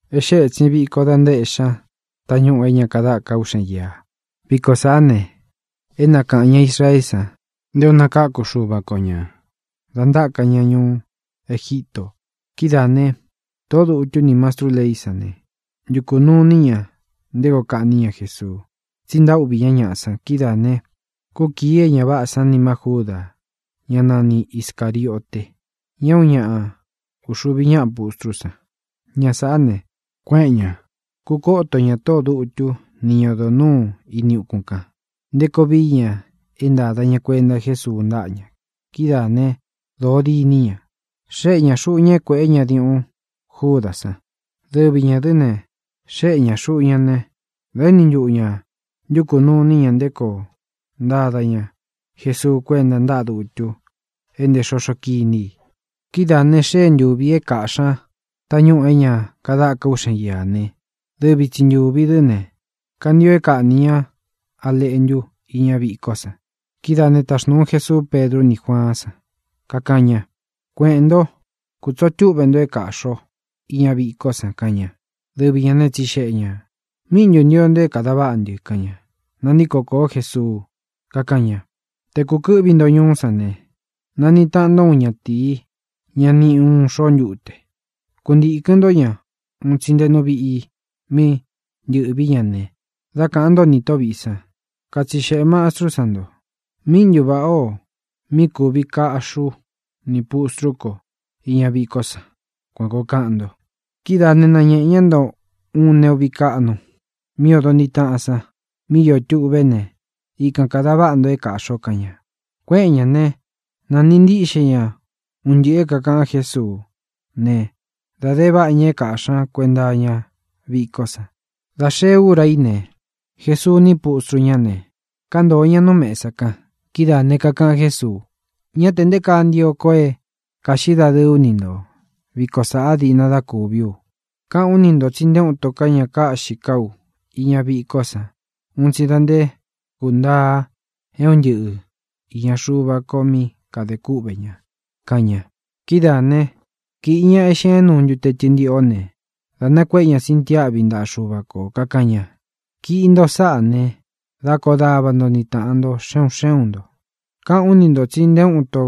E xée ētsin viko da ntaéꞌxí ña tañúꞌū é ña kadáka uꞌxen íā. Viko sāꞌá ne, é nakaꞌān ña Israeé san nté ō nakáku Xuva ko ña dā ntáka ña ñuú Egítō. Kidáā né, tōꞌó dutu ní mastrú leí san ne, ntukū nuu iní ña nté koo kaꞌní ña Jesuu, tsi ntaúꞌvī ñá ñaꞌa san. Kidáā ne, kúkīi é ña váꞌā san nima Júda, ñá nani Iscāriote, ña é uun ñaꞌa uxuvi ñáꞌa pustrú san. Ña sāꞌá ne, kuéꞌen ña, kūkoto ñá tóꞌō dutu ni ñá odo nūú ini ukún kān, nté koo vií ña é ntāda ña kuenta Jésuu ntáꞌa ña. Kidáā né, dōo diní ña. Xéꞌe ñā xuꞌu ña é kuēꞌé ña diuꞌun Júdā san. Dɨvi ñā dɨ́ ne, xéꞌe ñā xuꞌu ñá ne, dā éni ntuꞌu ña ntukū nuu iní ña nté koo ntada ña Jesuu kuénta ntáꞌa dutu é ntē xoxó kiní i. Kidáā ne, xée ntūvi é kāꞌxí ña tañúꞌū é ña kadáka uꞌxen íā ne, dɨvi tsi ntūvi dɨ́ ne, kantio é kaꞌnī ñá a leꞌntu iña vikó san. Kidáā né, taxnūu Jésuú Pedru ní Juaán san, kakaꞌan ña: —Kueꞌēn ntó, kūtsoo túꞌve nto é kāꞌxi o iña viko san —kaꞌan ña. Dɨvi ñā né, tsixeꞌe ñā: —¿Míꞌi ntū ntio nto é kāda váꞌa ntɨ? —kaꞌan ña. Nantíko kōó Jesuu, kakáꞌan ña: —Te kūkɨ́ꞌvi nto ñuú san ne, naniꞌi taꞌan nto úun ñatīi, ñá niꞌi uun xoó ntute. Kuntīkɨn ntó ña un tsi nte nú viꞌi mí ntɨ̄ꞌvi ña ne, dá kāꞌan ntó nī tóꞌo vīꞌi san: “Katsixeꞌē Mastrú san nto: ¿Míꞌi ntu vāꞌá o mí kūvi kaꞌxí u nī pustrú ko iña vikó san?”, kuan kōo kaꞌan nto. Kidáā né, nañēꞌe ñá nto uun neꞌu viꞌi kaꞌnu mí odo ntiꞌi taꞌan san mí iō tuꞌvé ne, ikan kāda váꞌa nto é kāꞌxi o —kaꞌan ña. Kuéꞌen ñā né, nāniꞌi ntíꞌxe ña un ntɨꞌɨ̄ é kākaꞌan Jésuú ne, dā de váꞌa ña é kāꞌxí ña kuenta iña vikó san. Dā xee úra í ne, Jesuu ní pustru ñá ne, kántōo ña nú mesa kan. Kidáā ne, kakaꞌan Jésuu: —Ñá tē nté kaa ntio ko é kāꞌxí dadɨɨ ú ni nto viko sāꞌa diꞌna dá kūví u. Káꞌān ú ni ntō tsi nté uun ito ká ña kaꞌxí ka ú iña viko san un tsi da nté kūntaa é un ntɨꞌɨ īña Xuva ko mí kadē kúꞌvē ña —kaꞌan ña. Kidáā né, kīꞌi ña eꞌxin é ñuꞌu ntute tɨntiꞌó ne, dā nakuéꞌe ña sintiáꞌvi ntaꞌa Xuva kō, kakaꞌan ña: —Kiꞌi nto sáꞌā ne, dá koꞌo dava nto ni tāꞌan nto xe un xé un ntō. Káꞌān ú ni ntō tsi nté uun ito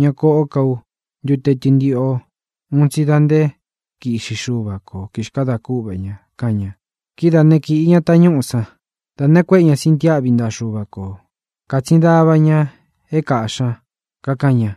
ña koꞌó ka ú ntute tɨntiꞌo un tsi da nté kiꞌxi Xuva ko, kīxkada kúꞌvē ña —kaꞌan ña. Kidáa ne, kīꞌi ña tañúꞌū san, da nakuéꞌe ña sintiáꞌvi ntaꞌa Xuva kō. Kātsin dava ña é kāꞌxí ña, kakaꞌan ña: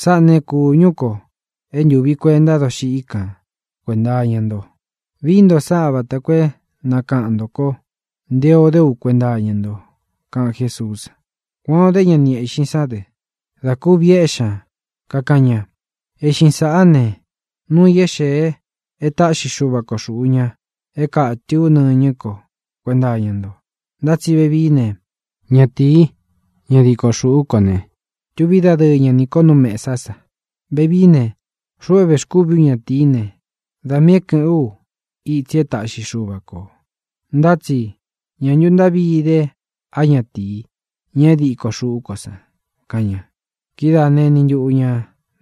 —Sáꞌā né, kūñú ko é ntūvi kuenta dóxiꞌí kān kuenta iña nto. Vii nto sáꞌā vata koo é nakaꞌan ntō ko nté ō dé u kuenta iña nto —kaꞌan Jésuú san. Kuan ō dé ña ni eꞌxin san dɨ dā kuvi éꞌxi ña, kakaꞌan ña: —Eꞌxin sāꞌá ne, núu ī é xēe é taꞌxi Xuva ko xūꞌu ña é kātɨ ú nɨñɨ́ ko kuenta iña nto. Ntá tsi vevií ne, ñatīi, ña diko xuꞌú ko ne, tuví dadɨɨ ña nī ko nú mesá sa. Vevií ne, xuꞌu é vēxkúvi ú ñatīí ne, da miī é kɨ̄ꞌɨ́n u itsi e táꞌxi Xuva kō, ntá tsi ¡ñā ntu ntáꞌvi ide á ñatīi, ña é diko xūꞌú ko san! —kaꞌan ña. Kidáa ne, eni ntuꞌu ñā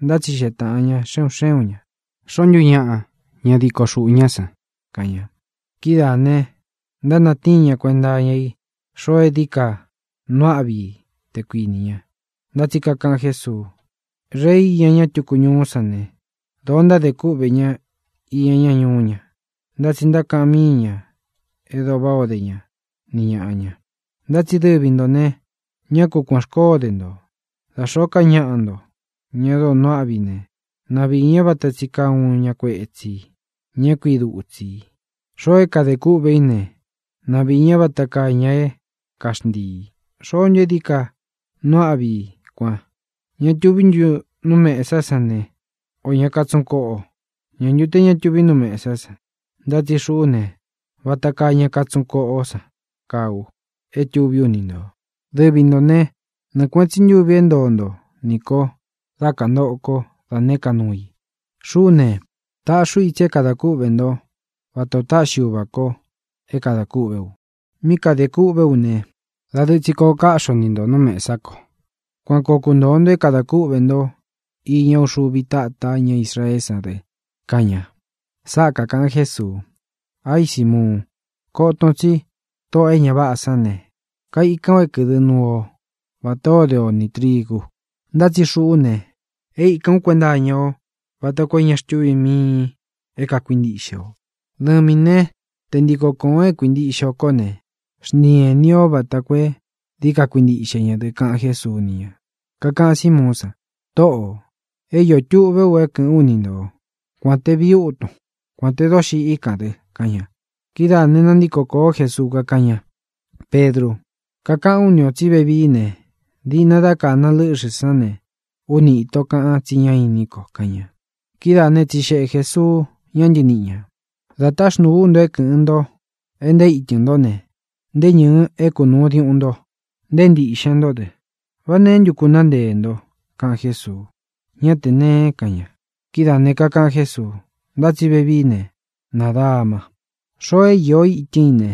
ntátsixeꞌe tāꞌan ña xe un xé un ñā: —¿Xoō ntu ñáꞌa, ña diko xūꞌu ñá san? —kaꞌan ña. Kidáā ne, ntánatíin ñā kuenta iña i xoo é dií ka nuu áꞌvi i, te kuinī ña. Ntá tsi kakaꞌan Jésuu: —Rei iña ña túku ñuú san ne, dōo ntádē kúꞌvē ñá iña ñá ñuú ña. Ntá tsi ntákaꞌan míi ñā e dóo váꞌā ó de ña ni ñāꞌa ña. Ntá tsi dɨvi ntō ne, ñá ku kuān xkoó de ntō. Dā xóo ká ñaꞌa nto, ña dóo nuu áꞌvi i ne, na viī ña vata tsi kaa uun ña kuetsī, ña é kui dutsi i. Xoo é kade kúꞌve i ne, na viī ñá vata kaa ña é kaxntiī. ¿Xoó ntu é dií ka nuu áꞌvi i kuan: ña tuví ntu nú mesá san ne, ō ña katsuꞌun koꞌo? ¿Ñā ntu te ñá tuvi nú mesá san? Ntá tsi xuꞌú ne, vata kaa ña katsuꞌun koꞌo san kaa u é tuví u ni ntō. ʼDɨvi ntō né, nɨɨ kuēꞌen tsí ntuvi é ntoo nto nī ko dá kantoꞌo kó da nēé ka nuu i. Xuꞌú ne, taꞌxi ú itsi é kadā kúꞌvē ntó vata ō táꞌxi uva kō é kada kúꞌve u. Mí kadē kûꞌvé u ne, dadɨɨ tsi koꞌo káꞌxi o ni ntō nú mesá ko. Kuan koo kuntōo nto é kadā kúꞌvē nto íña uxuvi táta ña Israeé san dɨ —kaꞌan ña. Sáꞌa kākaꞌan Jésuu: —¡Aí, Simuun! Koton tsí tóꞌō e ña váꞌā san ne, kaikan o é kɨ̄dɨ́ nuu o vatā ó de o nī trigu. Ntá tsi xuꞌú ne, é īkán u kuenta iña o vata koo é ña xtuvín miin é kākuintiꞌxe o. Dɨvīn né, te ntiko kōon é kuintiꞌxe o kó ne, xntiin ēní o vata koo é dií ka kuintiꞌxe ña dɨ —kaꞌan Jésuu ni ña. Kakaꞌan Símuún san: —Tōꞌo, é iō tuꞌvé u é kɨ̄ꞌɨ́n u ni nto, kuān te viútun, kuān te dóxiꞌí kān dɨ —kaꞌan ña. Kidáā ne, nantíko kōó Jesuu, kakáꞌan ña: —Pedru, kakaꞌán u ni ō tsí vevií ne, diꞌna dá kāna lɨ́ꞌxɨ̄ sán ne, úni īto kaꞌan tsí ñá inín ko —kaꞌan ña. Kidáā né, tsixeꞌe Jēsuu ña ntɨníꞌi ñā: —Dā táxnūu ú nto é kɨ̄ꞌɨn nto e nté ītɨn ntó ne, nté ñɨ̄ɨ e kañúꞌu diuꞌun nto, nté ntīꞌxen ntó dɨ, ¿vá neé ntu kunaá nteē nto? —kaꞌan Jésuu. —Ñá tē nee —kaꞌan ña. Kidáā ne, kakaꞌan Jésuu: —Ntá tsi vevií ne, nadama. Xoo é īó itɨ́n i ne,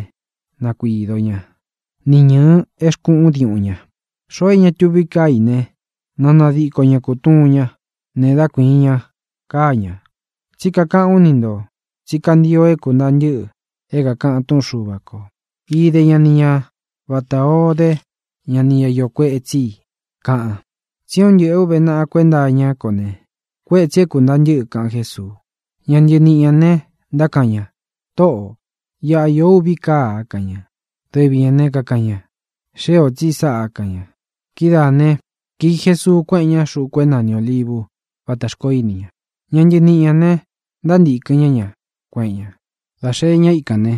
na kuīdo ñá, ni ñɨ̄ɨ é xkuꞌún diuꞌun ña. Xoo é ña tuvi káa i ne, na nadiko ña kūtuun ñá ne dá kuīin ña káa ña. Tsí kakaꞌán u ni ntō tsí kantio é kūntaa ntɨ́ꞌɨ é kākaꞌan túꞌun Xuva kō: “Ide ña ni ña vatā ó de ña nī ñá iō kuetsí i”, kaꞌan. Tsi é un ntɨꞌɨ̄ é ūve naꞌa kuenta iñá ko ne, kuetsi é kūntaa ntɨ́ꞌɨ —kaꞌan Jésuu. Ña ntɨniꞌi ñā ne, ntákaꞌan ña: —Tōꞌó, iꞌa īó uvi káa —kaꞌan ña. Dɨvi ñā ne, kakaꞌan ña: —Xée ō tsi sáꞌā —kaꞌan ña. Kidáā né, kīi Jesuu, kuéꞌen ña xūku é nani Ōlivu vátā xkoó ini ña. Ña ntɨniꞌi ñā ne, ntántīkɨn ñá ña, kueꞌen ña. Dā xee ña íkān ne,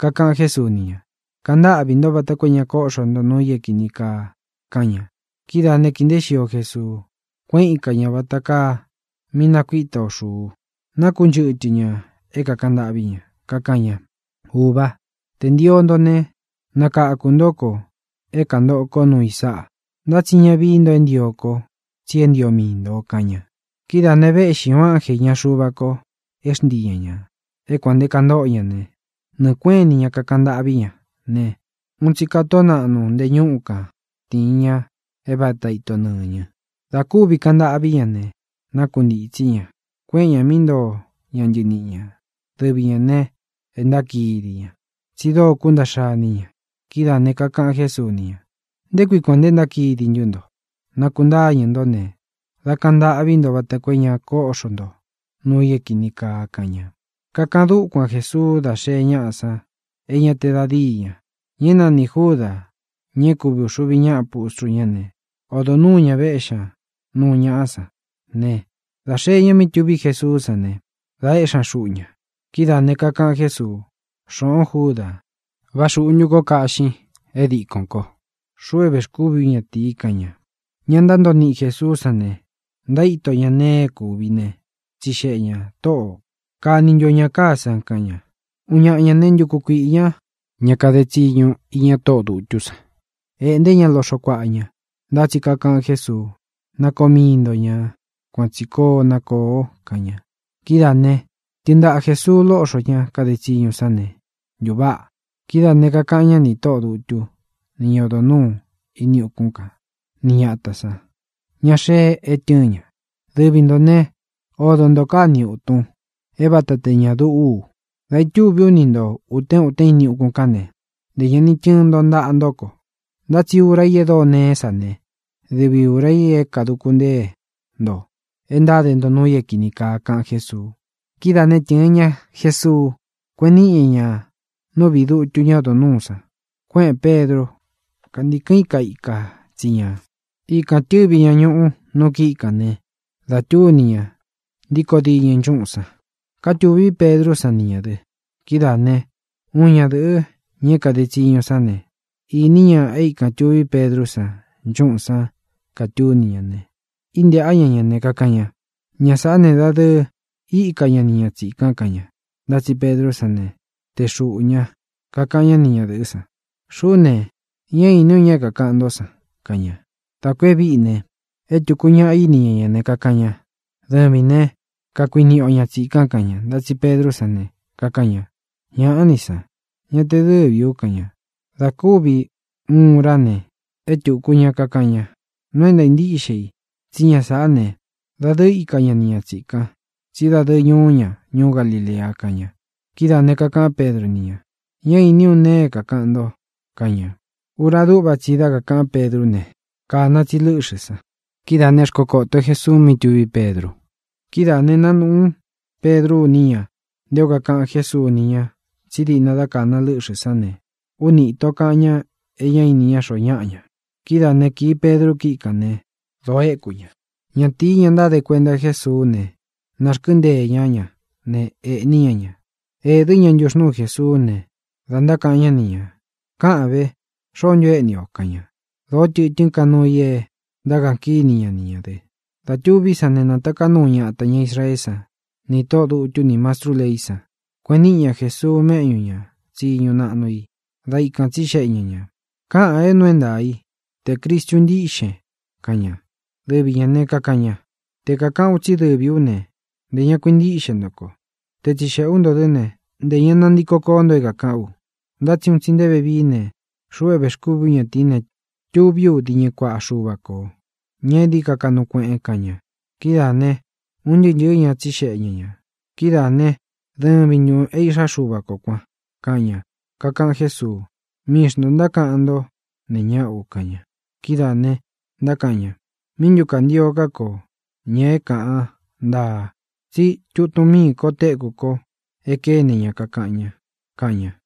kakaꞌan Jésuu ni ña: —Kantáꞌvī ntó vata koo é ña kóꞌxo nto nuu i é kīni kaa —kaꞌan ña. Kidáa ne, kīi nteé xio Jesuu, kuéꞌen ika ñā vata kaa mí nakuita ō xuu. Nákunchɨtɨ ñā é kaꞌan ntâꞌví ña. Kakaꞌan ña: —Ūvá, tē ntio nto ne, nakakū ntó ko é kantoꞌo kó nuu i sáꞌa. Ntá tsi ña vií nto é ntio kó, tsi é ntio mii ntō —kaꞌan ña. Kidáā ne, véꞌxi ūun ánjē iña Xuva ko é xntii ña ñā. É kuān nte kantóꞌo ña ne, nɨɨ̄ kuéꞌen ini ña kakaꞌan ntâꞌví ña ne, uun tsī katoó naꞌnu nte ñúꞌu kan tīin ña é vata ito nɨñɨ. Dā kúvi kaꞌan ntâꞌví ña ne, nákuntītsí ña, kueꞌen ña mí ntoo ña ntɨniꞌi ñā. Dɨvi ñā ne, e ntákidi ña, tsi dóo kuntaꞌxa iní ña. Kidáā ne, kakaꞌan Jésuu ni ña: —¿Nté kui kuān nte ntákidi ntú nto? Nakuntáñɨ̄ ntó ne, dá kaꞌan ntâꞌví nto vata koo é ña kóꞌxo nto nuu i é kīni kaa —kaꞌan ña. Kakaꞌan dúkuan Jesuu da xée ñáꞌa san é ña te da dií ña. Ña é nanī Júdā, ña é kuvi ūxuvi ñáꞌa pustru ñá ne, odo nuū ña véꞌxi ña nuu ñaꞌá san ne, dā xee ñá mí tuví Jesuú san ne, dā éꞌxi ña xuꞌu ña. Kidáā ne, kakaꞌan Jésuu: —Xoꞌōn, Júdā, ¿vá xūꞌu ntu kó kaꞌxin é dikōn kó, xuꞌu é vēxkúvi ú ñatīi? —kaꞌan ña. Ña ntántoo ni Jēsuú san ne, ntaíto ña nee é kuvi ne, tsixeꞌe ñā: —Tōꞌó, ¿kaꞌní nuu ntu o ñā káa san? —kaꞌan ña. Uun ñaꞌa ñā né, ntuku kuiꞌī ñá ña kade tsiñu iña tóꞌō dutú san, ēꞌnté ña loꞌxo kuaꞌa ña. Ntá tsi kakaꞌan Jésuu: —Na koo mii nto ñā. Kuan tsi koo na kōo —kaꞌan ña. Kidáā ne, tɨɨn ntaꞌa Jēsuu lóꞌxo ña kade tsiñu san ne, ntuváꞌa. Kidáā ne, kakaꞌan ñá nī tóꞌō dutu ni ñá odo nūu ini ukún kan, ni ñatā san, ña xee é tɨɨn ña: —Dɨvi ntō ne, odo nto káa ni ūtun, é vāta te ña duꞌú u. Da ītúvī ú ni ntō utén utén ini ukún kān ne, ntē ña ni tɨɨn ntáꞌa ntō ko, ntá tsi ura í e dóo neé sa ne, dɨvi ūra i é kāduku ntée nto e ntáde ntō nuu i é kīni kaa —kaꞌan Jésuu. Kidáa ne, tɨ̄ɨn ña Jesuu, kuéꞌen niꞌi ña ña nú viꞌī dutu ñá odo nūú san. Kuéꞌēn Pedru, kántikɨn íka ika tsi ñā. Ikān tɨ́vi ña ñuꞌu nu kíꞌi kān ne, da túni ña ntíkō diñɨ nchúꞌūn san. Kátūvi Pedrú san ni ñā dɨ. Kidáā né, uun ñadɨ̄ꞌɨ, ña é kade tsiñu sán ne, īní ña é ikān tuví Pedrú san nchúꞌūn san katúni ña ne, íntēꞌá ña ña ne, kakaꞌan ña: —Ña sāꞌá ne, dadɨɨ íka ña ni ña tsīkan —kaꞌan ña. Ntá tsi Pedrú san ne, tee xuꞌū ña, kakaꞌan ñá ni ñadɨ̄ꞌɨ́ san: —Xuꞌú ne, ñá īní u ña é kākaꞌan ntó san —kaꞌan ña. Dā kú e víꞌi ne, é tūku ñaꞌa íni ña ña ne, kakaꞌan ña: —Dɨvīn né, kakuiniꞌi o ña tsīkan —kaꞌan ña. Ntá tsi Pedrú san ne, kakaꞌan ña: —¡Ñāꞌá ni san! Ña te dɨ́vī ú —kaꞌan ña. Dā kúvi uun urá ne, é tūku ña kakaꞌan ña: —Nuu é ntaā ntíꞌxe i tsí ña sāꞌá ne, dadɨɨ íka ña ni ña tsīkan, tsí dadɨɨ ñuu ña ñuú Galilea —kaꞌan ña. Kidáā ne, kakaꞌán Pedru ni ña: —Ñá īní u nee é kākaꞌan nto —kaꞌan ña. Ura dúꞌva tsi i dá kakāꞌán Pedrú ne, kāna tsi lɨ́ꞌxɨ̄ san. Kidáa ne, xkokōtó Jesuu, mí tuví Pedru. Kidáā ne, nánūꞌú Pedru iní ña nté o kakaꞌan Jésuu ni ña tsí diꞌna dá kāna lɨ́ꞌxɨ̄ sán ne, úni īto kaꞌan ñá e ñá ini ñá xoo ñáꞌa ña. Kidáa ne, kīí Pedru kíꞌi kān ne, dōo éku ña. Ñatīí, ña ntáde kuenta Jésuú ne, nārkɨ́nteē ñá ña ne, ēꞌní ña ña. Ēdɨ́ ña ntuxnúu Jesuú ne, dā ntákaꞌan ñá ni ñā: —Káꞌān ve, ¿xoó ntu éꞌni i o? —kaꞌan ña. Dōó tɨtɨ́n ka nuu i é ntákaꞌan kíni ña ni ñā dɨ. Dā tuví san ne, nátaká nuu ñatā ña Israeé san nī tóꞌō dutu ní mastrú leí san. Kueꞌen níꞌi ña Jēsuu méꞌñū ña tsiñu naꞌnu i ne, dā íkān tsíxeꞌe ña ñā: —Káꞌan é nuu é ntaā i te Cristu ntíꞌxen —kaꞌan ña. Dɨvi ñā né, kakaꞌan ña: —Te kāꞌán u tsí dɨvī ú ne, ntē ña kuintíꞌxe nto ko. Te tsixeꞌē ú nto dɨ́ ne, ntē ña nantiko koó nto é kāꞌán u. Ntá tsi un tsi nté vevií ne, xuꞌu é vēxkúvī ú ñatīí ne, tuví u diñɨ kuaꞌa Xuva kō, ña é dií ka kaꞌnu kueꞌen —kaꞌan ña. Kidáā ne, un ntɨɨ́ ntɨɨ̄ ña tsíxeꞌe ña ñā: —Kidáa ne, ¿dɨvi ntūn é iꞌxá Xuva kō kuan? —kaꞌan ña. Kakaꞌan Jésuu: —Mii xntō ntákaꞌan ntó nee ñáꞌa u —kaꞌan ña. Kidáā ne, ntákaꞌan ña: —¿Míꞌi ntū kantio ká kō ña é kāꞌan ntaa? Tsí tutun mii ko téku ko e kéne ña kakaꞌan ña —kaꞌan ña.